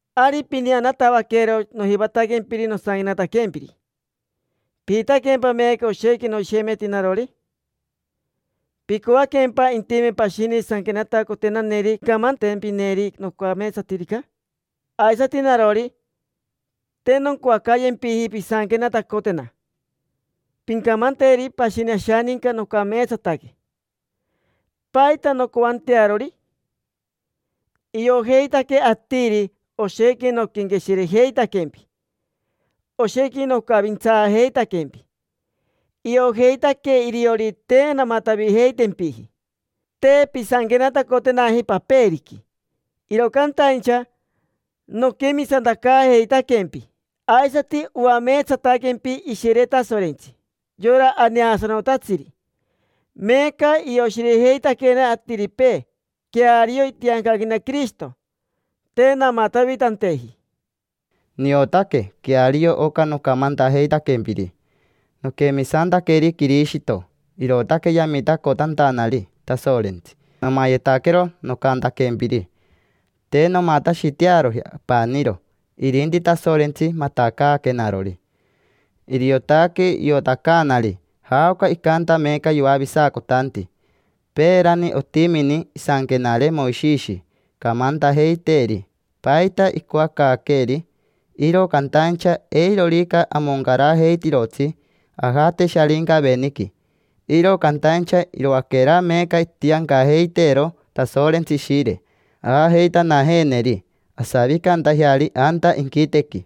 Ari pineanatavaquero nojivataquempiri nosanquenataquempiri. ¿Pijitaquempa meeca oshequi noshemeti narori? ¿Picoaquempa intime pashini sanquenatacotenaneri camantempineri nocameetsatirica? Aisati narori, te noncoacayempiji pisanquenatacotena, pincamanteri pashini ashaninca nocameetsataque. ¿Paita noncoantearori? Iojeitaque atiri oshequi noquenqueshirejeitaquempi, oshequi nocavintsaajeitaquempi. Iojeitaque iriori te namatavijeitempiji. Te pisanquenatacotenaji paperiqui, iro cantaincha noquemisantacaajeitaquempi, aisati oameetsataquempi Ishire Tasorentsi, yora aneasanotatsiri. Meeca ioshirejeitaquena atiripee queario itiancaquena Quirishito, te namatavitanteji. Niotaque queario oca nocamantajeitaquempiri. Noquemisantaqueri Quirishito, irootaque yamitacotantanari Tasorentsi nomayetaquero nocantaquempiri. Te nomatashitearoji apaniro, irinti Tasorentsi matacaaquenarori. Iriotaque iotacaanari jaoca icanta meeca yoavisacotanti. Peerani otimini isanquenare Moishishi camantajeiteeri paita icoacaaqueeri. Iro cantaincha eirorica amoncarajeitirotsi, ajate Sharincaveniqui. Iro cantaincha iroaquera meeca itiancajeiteero Tasorentsi Ishire, aajeitanajeeneri asavicantajeari anta inquitequi.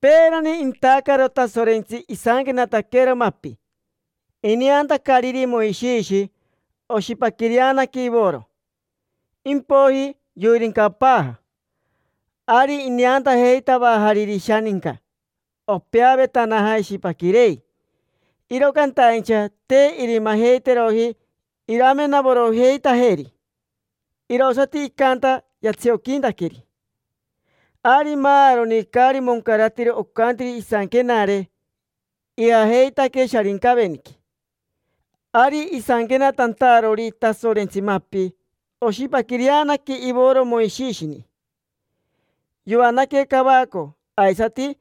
Peerani intacaro Tasorentsi, isanquenataquero mapi. Ineantacariri Moishishi, oshipaquireanaque ivoro, shipaquirerere; impoiji yoirincapaaja. Ari ineantajeitavajariri ishaninca opeavetanaja ishipaquirei, iro cantaincha te irimajeiteroji iramenavorojeitajeri: irosati icanta yatsioquintaqueri. Ari maaroni caari moncaratiro ocantiri isanquenare ijajeitaque Sharincaveniqui. Ari isanquenatantarori Tasorentsi mapi, oshipaquireanaque ivoro Moishishini, yoanaque cavaco, aisati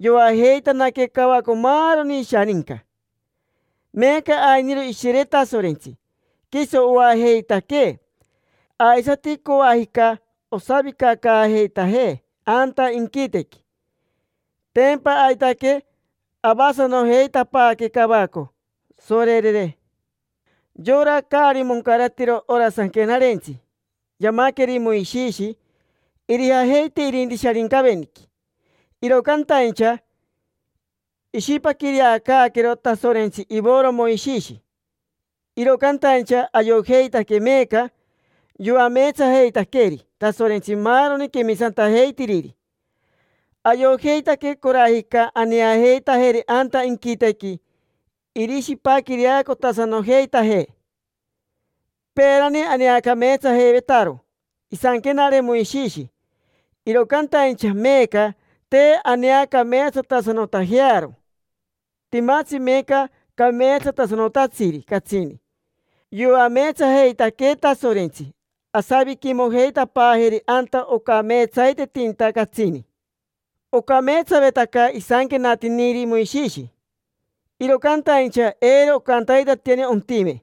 yoajeitanaque cavaco maaroni ishaninca. Meeca ainiro Ishire Tasorentsi, quiso oajeitaquee, aisati coajica osavicacaajeitajee anta inquitequi. Tempa aitaque avasanojeitapaaque cavaco, sorerere. Yora caari moncaratiro ora sanquenarentsi yamaqueri Moishishi irijajeite irinti Sharincaveniqui, iro cantaincha ishipaquireacaaquero Tasorentsi ivoro Moishishi. Iro cantaincha ayojeitaque meeca yoameetsajeitaqueri Tasorentsi maaroni quemisantajeitiriri, ayojeitaque corajica aneajeitajeri anta inquitequi irishipaquireacotasanojeitajee. Peerani aneacameetsajeivetaro isanquenare Moishishi, iro cantaincha meeca te aneacameetsatasanotajearo. Timatsi meeca cameetsatasanotatsiri catsini: yoameetsajeitaquee Tasorentsi, asaviquimojeitapaajeri anta ocameetsaitetinta catsini. Ocameetsavetaca isanquenatiniri Moishishi, iro cantaincha eiro ocantaitatiani ontime.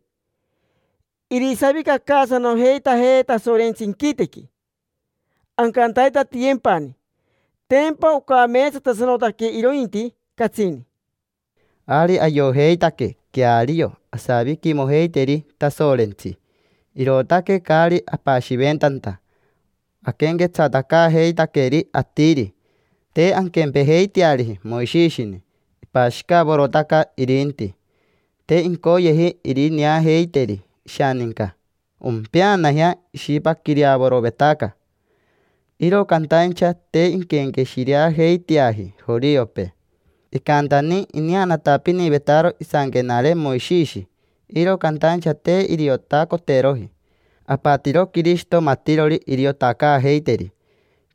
Irisavicacaasanojeitajee Tasorentsi inquitequi, ancantaitatiyempani: tempa ocameetsatasanotaque irointi, catsini. Ari ayojeitaque queario asaviquimojeiteri Tasorentsi, irootaque caari apashiventanta aquenquetsatacaajeitaqueri atiri. Te anquempejeiteariji Moishishini, ipashicavorotaca irinti: te incoyeji irineajeiteri ishaninca ompeanajea ishipaquireavorovetaca. Iro cantaincha te inquenqueshireajeiteaji joriopee. Icantani ineanatapinivetaro isanquenare Moishishi, iro cantaincha te iriotacoteroji. Apatiro Quirishito matirori iriotacaajeiteri.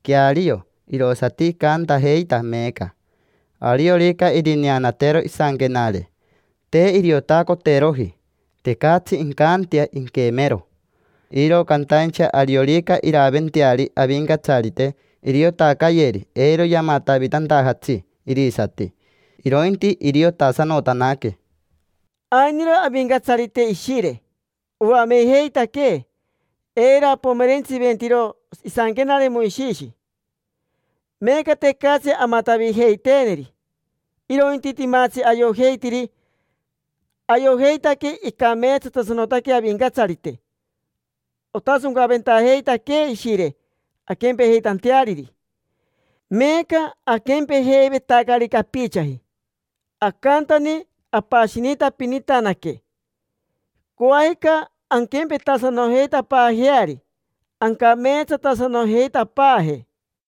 Queario, irosati icantajeita meeca. Ariorica irineanatero isanquenare, te iriotacoteroji: tecatsi incantea inquemero. Iro cantaincha ariorica iraventeari Avincatsarite, iriotacayeri eiro yamatavitantajatsi irisati; irointi iriotasanotanaque. Ainiro Avincatsarite Ishire, oamejeitaquee eiro apomerentsiventiro isanquenare Moishishi. Meeca tecatsi amatavijeiteeneri, irointi timatsi ayojeitiri. Ayojeitaque icameetsatasanotaque Avincatsarite. Otasoncaventajeitaquee Ishire anquempejeitanteariri. Meeca aquempejeivetacari capichaji. Acantani apashinitapinitanaque. Coajica anquempetasanojeitapaajeari, ancameetsatasanojeitapaaje.